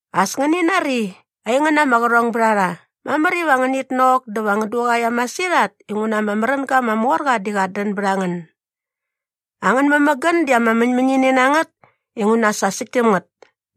As ngäni nari, aingän ama qärhongbärharha, mamär iva ngänit nok dä va ngän duqaia masirhat inguna ama märänga ama mor qa di qat dän bät a ngän. Angän mämägän di ama mäñmäñini na ngät inguna sa säkt täm ngät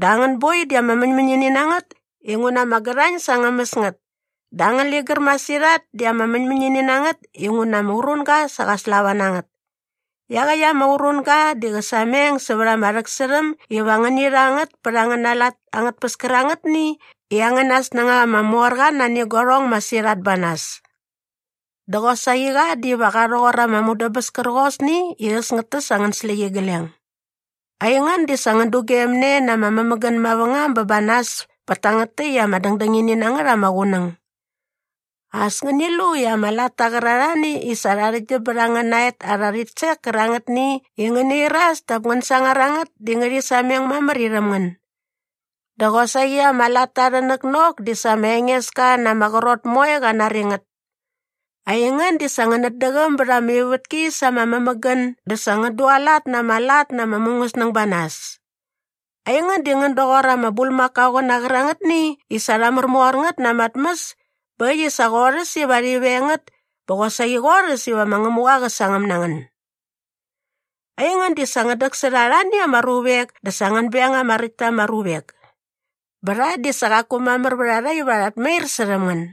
dä angän boi di ama mäñmäñini na ngät inguna ama gärhañ sa ngä mäs ngät. Dä angän ligär masirhat di ama mäñmäñini na ngät inguna ama urunga sa qa slava na ngät. Iaqäkt ama urunga di qä sameng sävät ama rhäksärhäm iva ngäni rha ngät pät angäna lat angät tpäs kärangätni i angäna snängaqa ama mor qa nani guarhong masirhat ba nas. Dä qosaqi qa diva qa rhoqor ama mudäbäs kärqosni i äs ngät täs angän släqyigleng. Aingän di sa ngän dugemne na ama mämägän mavängam bä ba nas pät tangät täkt ama dängdängini na ngät ama qunäng. As ngäni lu i ama latta qärarhani i sa rha arhäktgyäm bät angäna et arhä rhitsek kärangätni i ngäna iras dap ngän sangar a ngät di ngärhi sameng mamär irhäm ngän. Dä qosaqi ama latta arhä näknok di sa ma Engeska na ama qrot moe qa nari ngät. Aingän di sa ngänät däqäm bät ama ivätki sa ama mämägän dä sa ngän dualat na ama lat na ama mungäsnäng ba nas. Aingän di ngän doqor ama bulmakaoqäna qärangätni i sa rha märmor ngät na ama tmäs bä äkt i sa qorhäs iva rhi veng ngät bä qosaqi qorhäs iva ma Ngämuqa qa sangäm na ngän. Aingän di sa ngän däksärha arhani ama ruvek dä sa ngän beng ama räkt ta ama ruvek. Bä rha di sa qaku mamär vät a rha iva rhat mair särhäm ngän.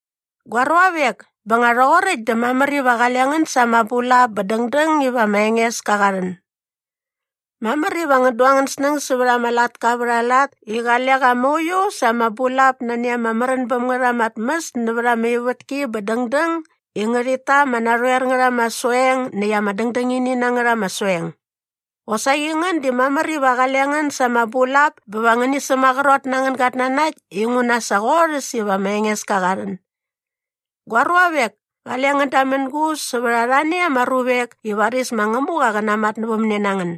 Gua ruavek, bä nga rhoqoräkt dä mamär iva qale ngän sa ama bulap bä dängdäng iva ma Engeska qa rhän. Mamär iva ngän du angän snäng sävät ama latka vät aa lat i qale qa mauiu sa ama bulap nani ama märän bäm ngät ama tmäs nävät ama ivätki bä dängdäng i ngärhit ta ama narhoer ngät ama soeng näkt ama dängdängini na ngät ama soeng. Qosaqi ngän di mamär iva qale ngän sa ama bulap bä va ngäni sämaqrot na angän gatnanakt inguna sa qorhäs iva ma Engeska qa rhän. Gua ruavek, kale ngän damängus sävät arhani ama ruvek i varis ma Ngämuqa qä namatnävämne na ngän.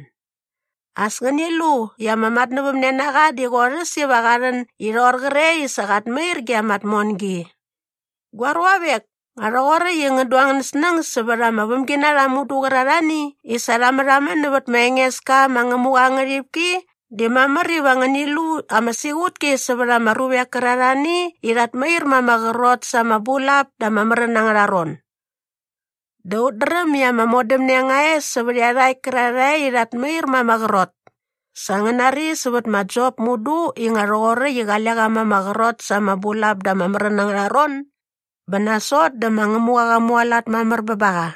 As ngäni lu i ama matnävämnenaqa di qorhäs iva qa rhän i rhoqor qre i sa qat mair ge ama tmongi. Gua ruavek, nga rhoqoräkt i ngän du angän snäng sävät ama vämginarha mudu qärarhani i sa rha märhamän nävät ma Engeska ma Ngämuqa aa ngärhipki di mamär iva ngäni lu ama siqutki sävät ama ruvek kärarhani i rhat mair ma ama qrot sa ama bulap da ama märän angärha ron. Dä ut dräm i ama modämne nga e sävät iarhakt kärarhae i rhat mair ma ama qrot. Sa ngän nari sävät ma Jop mudu i nga rhoqoräkt i qale qa ma ama qrot sa ama bulap da ama märän angärha ron bä nasot dä ma Ngämuqa qa mualat mamär bä ba qa.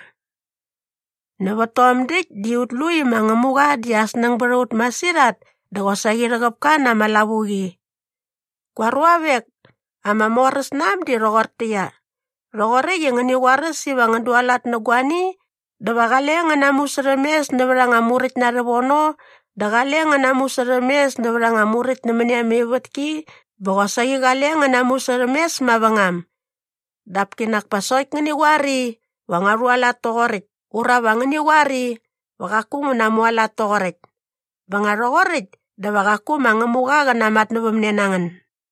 Nävät tom däkt di ut lu i ma Ngämuqa di aa snäng bät a ut masirhat dä qosaqi rhäqäp ka na ama lavuqi. Gua ruavek, ama moräsnaäm di rhoqortäqyia, rhoqoräkt i ngäni qoaräs iva ngän dualat nä guani dä va qale ngän namusärhämes nävät anga muräkt na rhävono dä qale ngän namusärhämes nävät anga muräkt nämäni ama ivätki bä qosaqi qale ngän namusärhämes mavängam. Dap kinak pa sokt ngäni qoar i, “Va ngua rhualat toqoräkt” ura va ngäni qoar i, “Va qaku ngu namualat toqoräkt.” Bä nga rhoqoräkt dä va qaku ma Ngämuqa qä namatnävämne na ngän.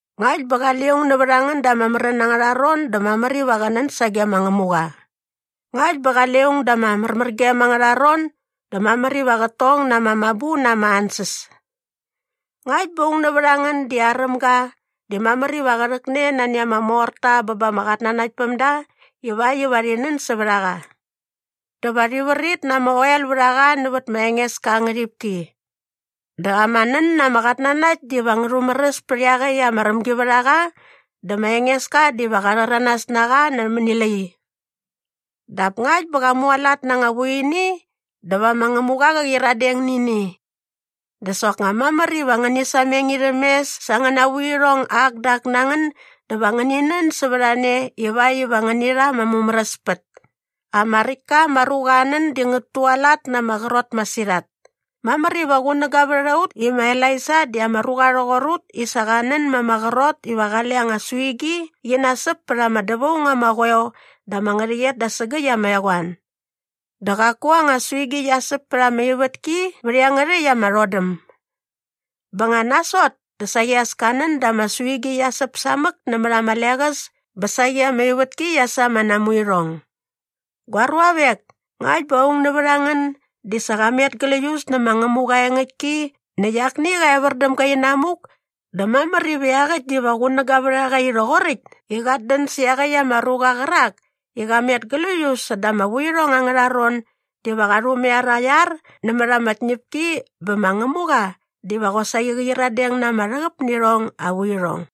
Ngakt bä qale aung nävät a ngän da ama märän angärha ron dä mamär iva qä nän sage ma Ngämuqa. Ngakt bä qale aung da ama märmärgem angärha ron dä mamär iva qät tong na ama mabu na ama ansäs. Ngakt bä aung nävät a ngän di aräm ga dä mamär iva qä rhäkne nani ama morta bä ba ama qatnanaktpämda ivakt iva rhi nän sävät a qa. Dä va rhi vrit na ama oel vät a qa nävät ma Engeska aa ngärhipki. Dä ama nän na ama qatnanakt diva ngä rhumäräs pät iaqäkt ama rämgivärhaqa dä ma Engeska diva qa rhäranas na qa nämäni lai. Dap ngakt bä qa mualat na anga vuini dä va ma Ngämuqa qä qyiradeng nä ini. Dä soknga mamär iva ngäni sameng irhäm mes sa angäna vuirhong ak dä ak na ngän dä va ngäni nän sävät a ne ivakt iva ngäni rha ama mumäräspät. Ama räkt ka ama ruqa aa nän di ngät tualat na ama qrot masirhat. Mamär iva qunäga vät a ut i ma Elaija di ama ruqa rhoqor ut i sa qa nän ma ama qrot iva qale anga suigi qi nasäp pät ama dävaung ama qoeo dä ama ngärhäqyet da sägäkt ama eqoan. Dä qaku anga suigi qia säp pät ama ivätki vät iangärhäkt ama rhodäm. Bä nga nasot dä saqi as ka nän dä ama suigi qia säp samäk nämät ama leqäs bä saqi ama ivätki qia sa ama namuirhong. Gua ruavek, ngakt bä aung nävät a ngän di sa qa met gläius nä ma Ngämuqa aa engäktki näkt akni qä evär däm ga inamuk dä mamär iva iaqäkt diva qunäga vät a qa i rhoqoräkt i qat dän sä iaqäkt ama ruqa qärak i qa met gläius säda ama vuirhong angärha ron diva qa rhumaiar aa iar nämät ama tñäpki bä ma Ngämuqa diva qosaqi qä qyiradeng na ama rhäqäp nä irhong aa vuirhong.